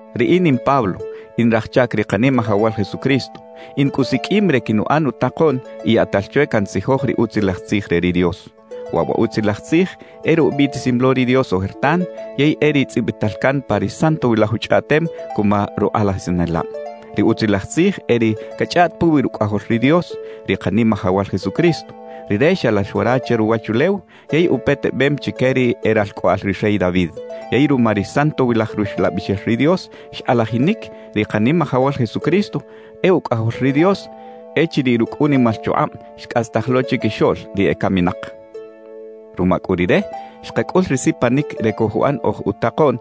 Riꞌin in Pablo, in raj chac ri Kanimajawal Jesucristo. In cꞌu siqꞌuim re quinuꞌan utakoꞌn y yaꞌtal chwe cantzijoj ri Utzilaj Tzij re ri Dios. Waꞌ wa Utzilaj Tzij e ri ubiꞌtisim lo ri Dios ojertan, yey e ri tzꞌibital can pa ri Santowilaj Uchꞌaꞌtem cuma rukꞌalajisanelab. Ri Utzilaj Tzij e ri cachꞌaꞌt puwi Rucꞌajol ri Dios, ri Kanimajawal Jesucristo. Rire xalax wara che ruwachulew yey upetebem chique ri e ralcꞌoꞌal ri rey David. Yey ruma ri Santowilaj Ruxlabixel ri Dios, xkꞌalajinic ri Kanimajawal Jesucristo e Ucꞌajol ri Dios echiriꞌ rucꞌ unimal chukꞌab xcꞌastaj lo chiquixoꞌl ri ecaminak. Ruma cꞌu Rire, xkacꞌul ri sipanic re cojuꞌan oj utakoꞌn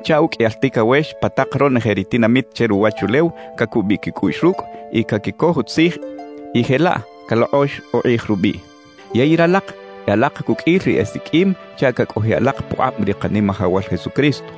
chaꞌ uqꞌuiyal ticawex pa tak ronoje ri tinamit che ruwachulew cacubiꞌ quicꞌuꞌx rucꞌ y caquicoj utzij y jelaꞌ calokꞌox ukꞌij rubiꞌ. Yey ralak e alak cuqꞌuil ri esiqꞌuim chaꞌ cacꞌojiꞌ alak pukꞌab ri Kanimajawal Jesucristo.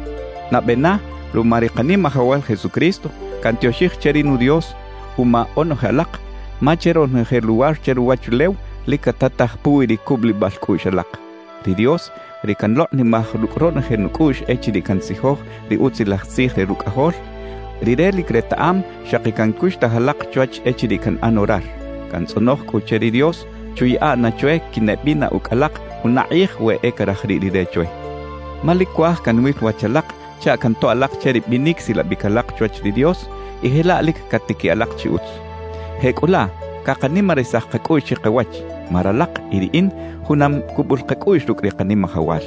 Nabe na, ruma ri Kanimajawal Jesucristo, cantioxij che ri nu Dios uma onoje alak, ma che ronoje luwar che ruwachulew lic catataj puwi ri cubulibal cꞌuꞌx alak. Ri Dios, ri canlokꞌnimaj rucꞌ ronoje nucꞌuꞌx echiriꞌ cantzijoj ri Utzilaj Tzij re Rucꞌajol, Rire lic retaꞌam xaki cancuxtaj alak chwach echiriꞌ canꞌan orar. Cantzꞌonoj cꞌu che ri Dios chuyaꞌa na chwe quineꞌbina ucꞌ alak juna kꞌij we e caraj riꞌ Rire chwe. Ma lic cuaj canwil wach alak chaꞌ cantoꞌ alak che ri binic silabic alak chwach ri Dios y jelaꞌ lic catiquiꞌ alak chi utz. Jecꞌulaꞌ cakanimarisaj kacꞌuꞌx chikawach, ma ralak y riꞌin junam cubul kacꞌuꞌx rucꞌ ri Kanimajawal.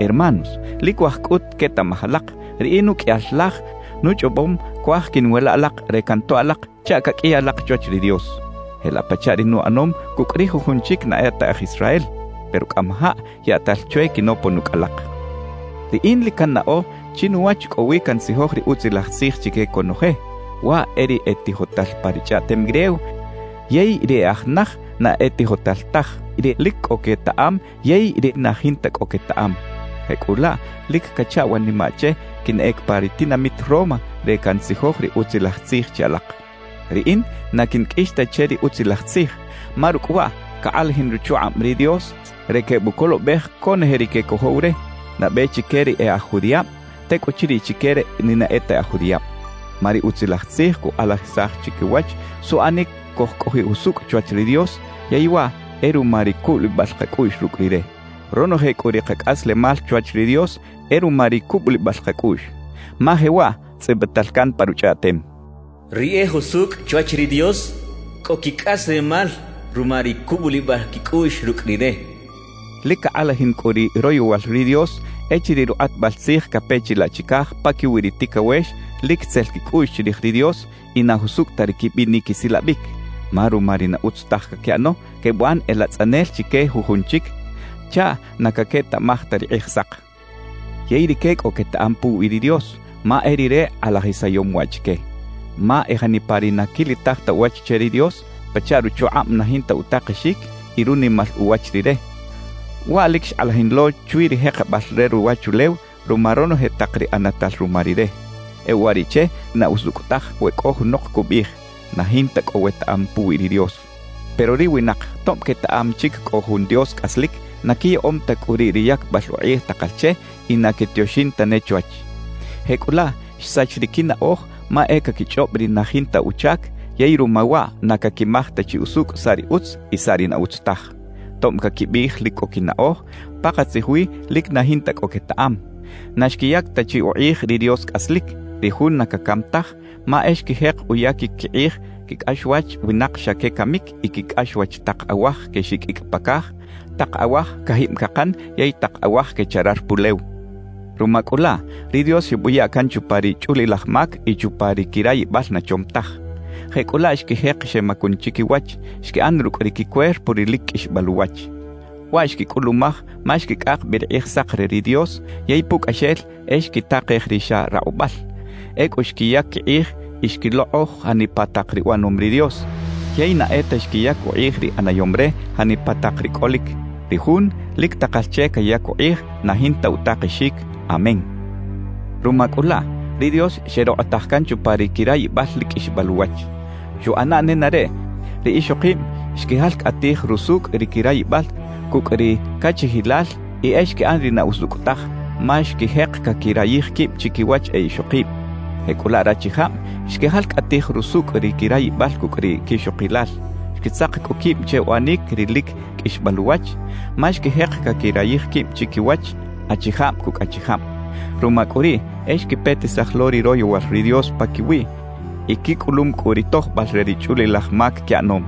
Hermanos, lic cuaj cꞌut quetaꞌmaj alak, riꞌin uqꞌuiyal laj nuchꞌobom cuaj quiꞌnwila alak re cantoꞌ alak chaꞌ caqꞌuiy alak chwach ri Dios, jelaꞌ pachaꞌ ri nuꞌanom cucꞌ ri jujun chic na e ta aj Israel. Pero cꞌamajaꞌ yaꞌtal chwe quinopon ucꞌ alak. Riꞌin lic cannaꞌo chinuwach cꞌo wi cantzijoj ri Utzilaj Tzij chique conoje; waꞌ e ri e tijotal pa ri chꞌaꞌtem griego yey ri e aj naj na e tijotal taj, ri lic cꞌo quetaꞌam yey ri na jinta cꞌo quetaꞌam. Jecꞌulaꞌ lic cacha wanimaꞌ che quinꞌec pa ri tinamit Roma re cantzijoj ri Utzilaj Tzij che alak. Riꞌin na quinqꞌuix ta che ri Utzilaj Tzij, ma rucꞌ waꞌ cakꞌalajin ruchukꞌab ri Dios re quebucolobej conoje ri quecojow re; nabe chique ri e aj judiꞌab, tecꞌuchiriꞌ chique ri na e ta aj judiꞌab. Ma ri Utzilaj Tzij cukꞌalajisaj chikawach suꞌanic cojcꞌojiꞌ jusucꞌ chwach ri Dios, yey waꞌ e ruma ri cubulibal kacꞌuꞌx rucꞌ Rire; ronoje cꞌu ri kacꞌaslemal chwach ri Dios e ruma ri cubulibal kacꞌuꞌx. Ma jewaꞌ tzꞌibital can pa Ruchꞌaꞌtem: Ri e jusucꞌ chwach ri Dios, cꞌo quicꞌaslemal ruma ri cubulibal quicꞌuꞌx rucꞌ Rire cachaꞌ. Lic cakꞌalajin cꞌu ri royowal ri Dios echiriꞌ rukꞌatbal tzij cape chilaꞌ chicaj paquiwi ri ticawex lic itzel quicꞌuꞌx chirij ri Dios y na jusucꞌ ta ri quibinic quisilabic; ma ruma ri na utz taj caquiꞌano, quebuꞌan e latzꞌanel chique jujun chic chaꞌ na caquetaꞌmaj ta ri Kꞌijsak. Yey rique cꞌo quetaꞌam puwi ri Dios, ma e Rire kꞌalajisayom waꞌ chique. Ma e janipa ri na quilitaj ta uwach che ri Dios, pachaꞌ ruchukꞌab na jinta utakexic y runimal uwach Rire, waꞌ lic xkꞌalajin lo chwi ri jekebal re ruwachulew ruma ronoje tak ri ꞌanatal ruma Rire. E uwariꞌche na usucꞌ taj we cꞌo junok cubiꞌij: «Na jinta cꞌo wetaꞌam puwi ri Dios.» Pero ri winak tob quetaꞌam chic cꞌo jun Dios cꞌaslic, na quiyaꞌom ta cꞌu riꞌ ri yacbal ukꞌij takal che y na quetioxin tane chwach. Jecꞌulaꞌ xsach ri quinaꞌoj ma e caquichꞌob ri na jinta uchac; yey ruma waꞌ na caquimaj ta chi usucꞌ saꞌ ri utz y saꞌ ri na utz taj. Tob caquibiꞌij lic cꞌo quinaꞌoj, pakatzij wi lic na jinta cꞌo quetaꞌam. Na xquiyac ta chi ukꞌij ri Dios cꞌaslic, ri Jun na cacam taj; ma e xquijek uyaquic quikꞌij quicꞌaxwach winak xa quecamic y quicꞌaxwach tak awaj quexiqꞌuicꞌ pa caj, tak awaj cajib cakan yey tak awaj quecharar pulew. Ruma cꞌu laꞌ, ri Dios xebuya can chupa ri chꞌulilaj mac y chupa ri quirayibal na chom taj. Jecꞌulaꞌ xquijek xemacun chiquiwach, xquiꞌan rucꞌ ri quicuerpo ri lic qꞌuixbal uwach. Waꞌ xquicꞌulumaj ma xquicꞌak bi ri Kꞌijsak re ri Dios yey pucꞌaxel e xquitakej ri xa rakꞌubal. Ecꞌu xquiyac quikꞌij y xquilokꞌoj janipa tak ri uꞌanom ri Dios; yey na e ta xquiyac ukꞌij ri ꞌanayom re janipa tak ri cꞌolic, ri Jun lic takal che cayac ukꞌij na jinta utakexic. Amén. Ruma cꞌu laꞌ, ri Dios xerokꞌotaj can chupa ri quirayibal lic qꞌuixbal uwach. Xuꞌana nenareꞌ ri ixokib xquijalcꞌatij rusucꞌ ri quirayibal cucꞌ ri cachijilal y e xquiꞌan ri na usucꞌ taj, ma xquijek caquirayij quib chiquiwach e ixokib. Jecꞌulaꞌ rachijab xquijalcꞌatij rusucꞌ ri quirayibal cucꞌ ri quixokilal; xquitzak cꞌu quib che uꞌanic ri lic qꞌuixbal uwach, ma xquijek caquirayij quib chiquiwach, achijab cucꞌ achijab. Ruma cꞌu riꞌ e xquipetisaj lo ri royowal ri Dios paquiwiꞌ y quicꞌulum cꞌu ri tojbal re ri chꞌulilaj mac quiꞌanom.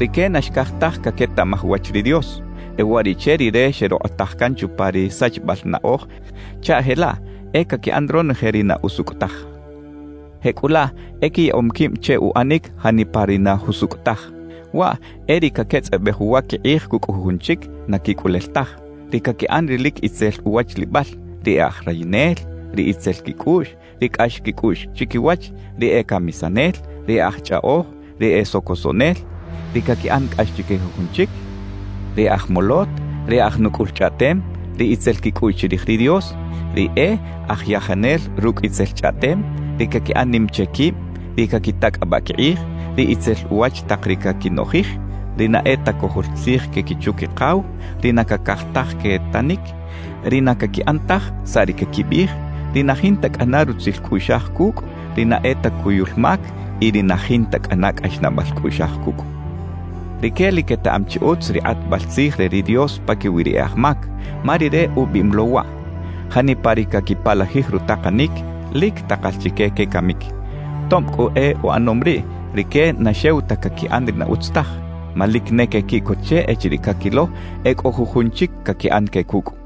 Rique na xcaj taj caquetaꞌmaj uwach ri Dios. E uwariꞌche Rire xerokꞌotaj can chupa ri sachibal naꞌoj chaꞌ jelaꞌ e caquiꞌan ronoje ri na usucꞌ taj. Jecꞌulaꞌ e quiyaꞌom quib che uꞌanic janipa ri na jusucꞌ taj: waꞌ e ri caquetzꞌabej uwa quikꞌij cucꞌ jujun chic na quicꞌulel taj, ri caquiꞌan ri lic itzel uwachlibal, ri e aj rayinel, ri itzel quicꞌuꞌx, ri cꞌax quicꞌuꞌx chiquiwach, ri e camisanel, ri e aj chꞌaꞌoj, ri e socosoꞌnel, ri caquiꞌan cꞌax chique jujun chic, ri e aj molot, ri e aj nucꞌul chꞌaꞌtem, ri itzel quicꞌuꞌx chirij ri Dios, ri e aj yajanel rucꞌ itzel chꞌaꞌtem, ri caquiꞌan nim che quib, ri caquitacꞌabaꞌ quikꞌij, ri itzel uwach tak ri caquinoꞌjij, ri na e ta cojol tzij que quichu-quikaw, ri na cacaj taj quetanic, ri na caquiꞌan taj saꞌ ri caquibiꞌij, ri na jinta cꞌana rutzil cꞌuꞌxaj cucꞌ, ri na e ta cuyul mac y ri na jinta cꞌana cꞌaxnaꞌbal cꞌuꞌxaj cucꞌ. Rique lic quetaꞌam chi utz ri kꞌatbal tzij re ri Dios paquiwi ri e aj mac, ma Rire ubiꞌim lo waꞌ: Janipa ri caquipalajij rutakanic, lic takal chique quecamic. Tob cꞌu e uꞌanom riꞌ, rique na xew ta caquiꞌan ri na utz taj, ma lic ne quequiꞌcot che echiriꞌ caquilo e cꞌo jujun chic caquiꞌan que cucꞌ.